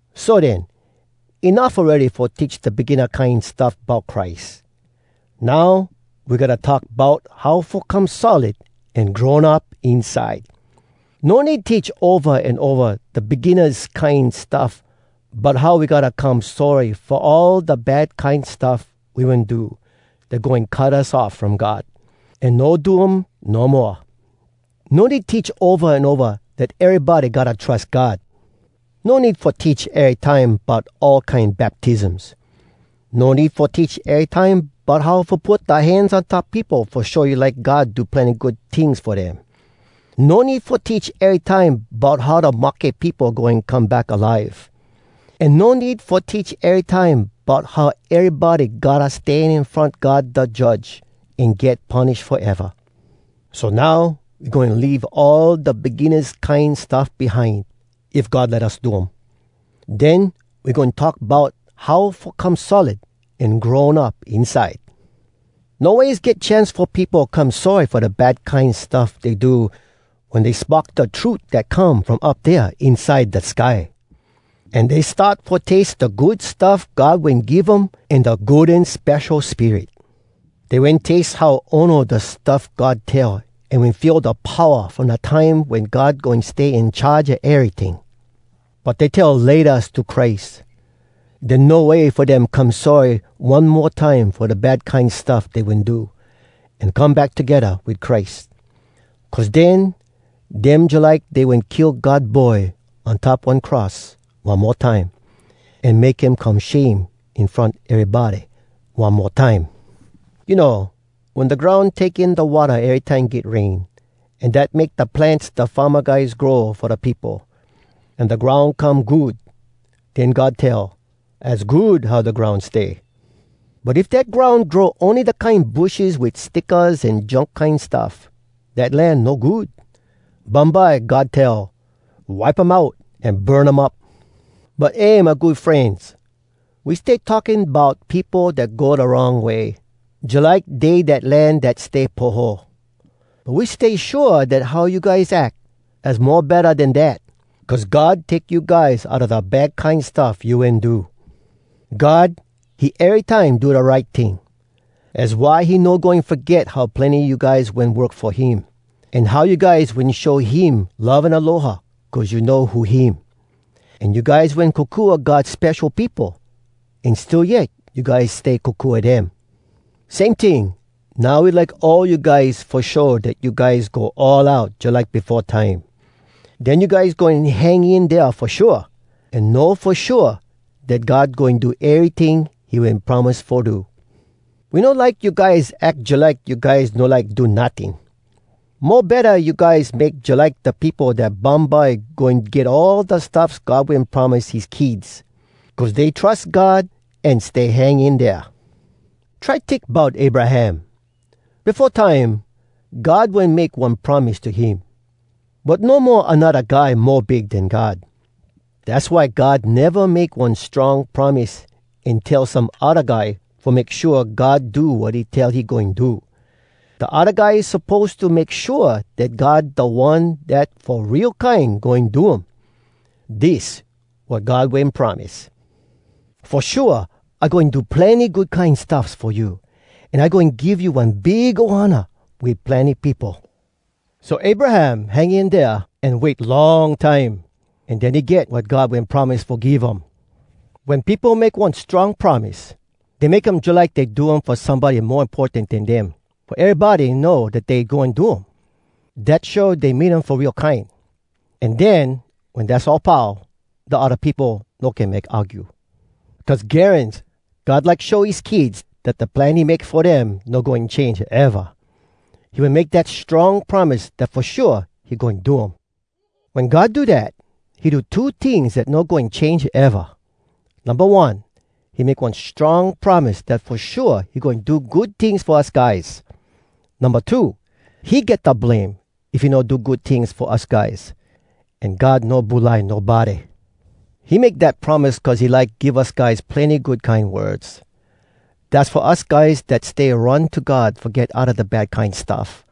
So den, enuff awready fo teach da beginna kine stuff bout Christ. Now we gotta talk bout how fo come solid an grown up inside. No need teach ova an ova da beginnas kine stuff bout how we gotta come sorry fo all da bad kine stuff we wen do dat goin cut us off from God, an no do um no moa. No need teach ova an ova dat erybody gotta trus God. No need fo teach erytime bout all kine baptisms. No need fo teach erytime bout how fo put da hands on top peopo fo show you like God do plenny good tings fo dem. No need fo teach erytime bout how da mahke peopo goin come back alive. An no need fo teach erytime bout how erybody gotta stan in front God da Judge an get punish foeva. So now, we goin leave all da beginnas kine stuff behind, if God let us do um. Den we goin talk bout how fo come solid an grown up inside. No ways get chance fo peopo come sorry fo da bad kine stuff dey do wen dey spock da trut dat come from up dea inside da sky. An dey start fo taste da good stuff God wen give um an da Good An Spesho Spirit. Dey wen taste how ono da stuff God tell an wen feel da powa from da time wen God goin stay in charge a eryting. But dey tell “Laytas” to Christ. Den no way fo dem come sorry one mo time fo da bad kine stuff dey wen do, an come back togedda wit Christ. Cuz den, dem jalike dey wen kill God Boy on top one cross one mo time, an make him come shame in front erybody one mo time. You know, wen da groun take in da watta erytime get rain, an dat make da plants da farma guys grow fo da peopo, an da groun come good, den God tell, “Az good how da groun stay!” But if dat groun grow ony da kine bushes wit stickas an junk kine stuff, dat land no good! Bumbye God tell, “Wipe um out an burn um up!” But eh, my good frenz! We stay talking bout peopo dat go da wrong way, jalike dey dat land dat stay poho. But we stay shua dat how you guys ack, az mo betta den dat, cuz God take you guys outa da bad kine stuff you wen do. God, he erytime do da right ting. Az why he no goin foget how plenny you guys wen work fo him, an how you guys wen show him love an aloha cuz you know who him. An you guys wen kokua God spesho peopo, an still yet you guys stay kokua dem. Same ting, now we like all you guys fo show dat you guys go all out jalike befo time. Den you guys goin hang in dea fo shua, an know fo shua dat God goin do eryting he wen promise fo do. We no like you guys ack jalike you guys no like do notting. Mo betta you guys make jalike da peopo dat bumbye goin get all da stuffs God wen promise his kids, cuz dey trus God an stay hang in dea. Try tink bout Abraham. Befo time, God wen make one promise to him. But no mo anodda guy mo big den God. Dass why God neva make one strong promise an tell some odda guy fo make shua God do wat he tell he goin do. Da odda guy suppose to make shua dat God da one dat fo real kine goin do um. Dis wat God wen promise: “Fo shua I goin do plenny good kine stuffs fo you, an I goin give you one big ohana wit plenny peopo.” So Abraham hang in dea an wait long time, an den he get wat God wen promise fo give um. Wen peopo make one strong promise, dey make um jalike dey do um fo somebody mo importan den dem fo erybody know dat dey goin do um. Dat show dey mean um fo real kine. An den wen dass all pau, da odda peopo no can make argue. Cuz garans God like show his kids dat da plan he make fo dem no goin change eva, he wen make dat strong promise dat fo shua he goin do um. Wen God do dat, he do two tings dat no goin change eva. Numba One, he make one strong promise dat fo shua he goin do good tings fo us guys. Numba Two, he get da blame if he no do good tings fo us guys. An God no bulai nobody. He make dat promise cuz he like give us guys plenny good kine words. Dass fo us guys dat stay run to God fo get outa da bad kine stuff,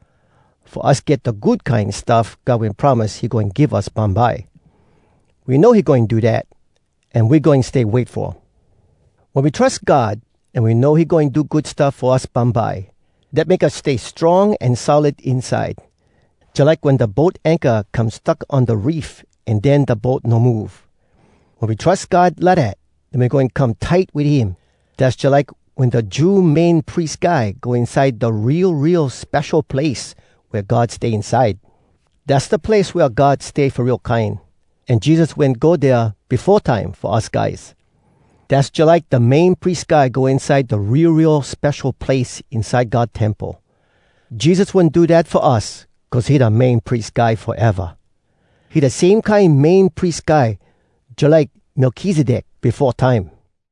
fo us get da good kine stuff God wen promise he goin give us bumbye. We know he goin do dat, an we goin stay wait fo um. Wen we trus God an we know he goin do good stuff fo us bumbye, dat make us stay strong an solid inside, jalike wen da boat anchor come stuck on da reef an den da boat no move. Wen we trus God lidat, den we goin come tight wit him. Dass jalike wen da Jew Main Pries Guy go inside da Real, Real Spesho Place wea God stay inside. Dass da place wea God stay fo real kine, an Jesus wen go dea befo time fo us guys. Dass jalike da Main Pries Guy go inside da Real, Real Spesho Place inside God Temple. Jesus wen do dat fo us cuz he da Main Pries Guy foeva. He da same kine Main Pries Guy jalike Melkizedek befo time.